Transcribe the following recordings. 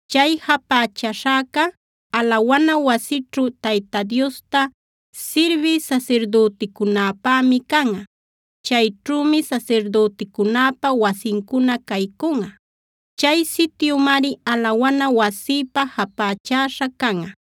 Chay japächaśhäca, alawana wasićhu Tayta Diosta sirbï sasirdüticunäpämi canꞌa. Chayćhümi sasirdüticunäpa wasincuna caycunꞌa. Chay sityumari alawana wasïpä japächaśha canꞌa.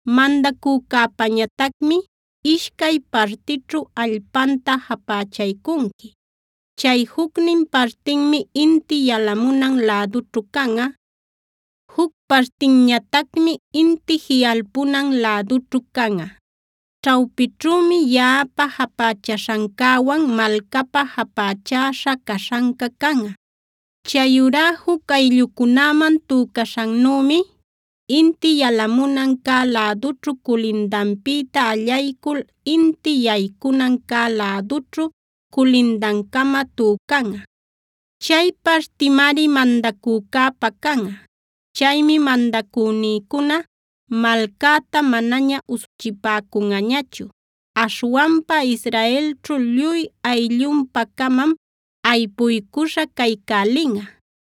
“Mandacücäpäñatacmi ishcay partićhu allpanta japächaycunqui. Chay jucnin partinmi inti yalamunan lädućhu canꞌa. Juc partinñatacmi inti jiꞌalpunan lädućhu canꞌa. Ćhawpićhümi yaꞌapä japächaśhancäwan malcapa japächäśha caśhanca canꞌa. Chayurá juc ayllucunäman tücaśhannümi inti yalamunan cä lädućhu culindanpïta allaycul inti yaycunan cä lädućhu culindancama tücanꞌa. Chay partimari mandacücäpä canꞌa. Chaymi mandacünïcuna malcäta manaña usuchipäcunꞌañachu. Aśhwanpa Israelćhu lluy ayllunpa-camam aypuycuśha caycälinꞌa.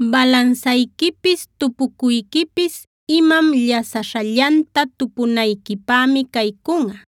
“Balansayquipis tupucuyquipis imam llasaśhallanta tupunayquipämi caycunꞌa.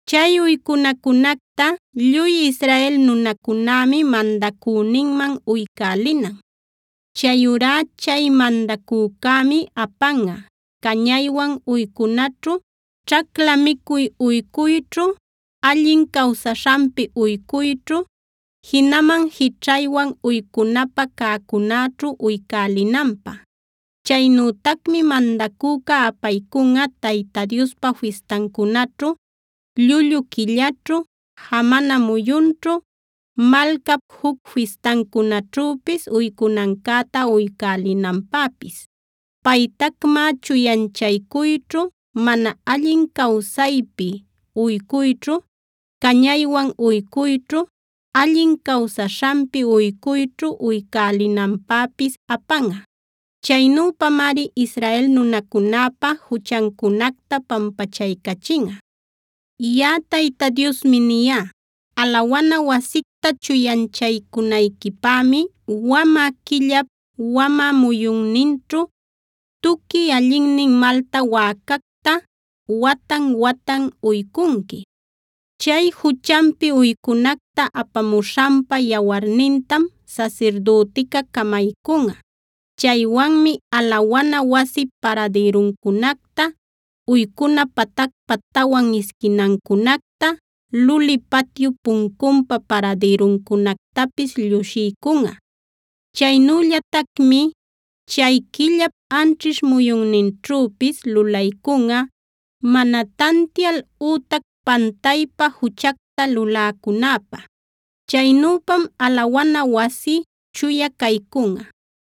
“Chay uycunacunacta lluy Israel nunacunämi mandacüninman uycälinan. Chayurá chay mandacücämi apanꞌa: cañaywan uycunaćhu, ćhacla micuy uycuyćhu, allin cawsaśhanpi uycuyćhu, jinaman jićhaywan uycunapä cäcunäćhu uycälinanpä. Chaynütacmi mandacüca apaycunꞌa Tayta Diospa fistancunaćhu, llullu quillaćhu, jamana muyunćhu, malcap juc fistancunaćhüpis uycunancäta uycälinanpäpis. Paytacmá chuyanchacuyćhu, mana allin cawsaypi uycuyćhu, cañaywan uycuyćhu, allin cawsaśhanpi uycuyćhu uycälinanpäpis apanꞌa. Chaynüpamari Israel nunacunäpa juchancunacta pampachaycachinꞌa. “Yaꞌa Tayta Diosmi niyá: Alawana wasicta chuyanchaycunayquipämi wamä quillap, wamä muyunninćhu tuqui allinnin malta wäcacta watan-watan uycunqui. Chay juchanpi uycunacta apamuśhanpä yawarnintam sasirdütica camaycunꞌa. Chaywanmi alawana wasip paradïruncunacta, uycuna patacpa tawan isquinancunacta, luli patyup puncunpa paradïruncunactapis llushiycunꞌa. Chaynüllatacmi chay quillap anćhish muyunninćhüpis lulaycunꞌa mana tantial ütac pantaypa juchacta luläcunäpä. Chaynüpam alawana wasi chuya caycunꞌa.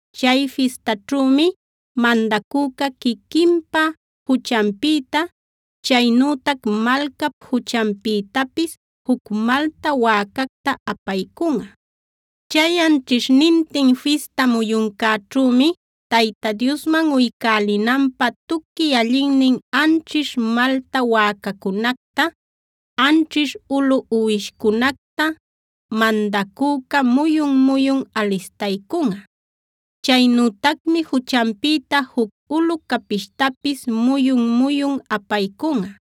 Chay fistaćhümi mandacüca quiquinpa juchanpïta, chaynütac malcap juchanpïtapis juc malta wäcacta apaycunꞌa. Chay anćhishnintin fista muyuncäćhümi Tayta Diosman uycälinanpä tuqui allinnin anćhish malta wäcacunacta, anćhish ulu uwishcunacta mandacüca muyun-muyun alistaycunꞌa. Chaynütacmi juchanpïta juc ulu capishtapis muyun-muyun apaycunꞌa.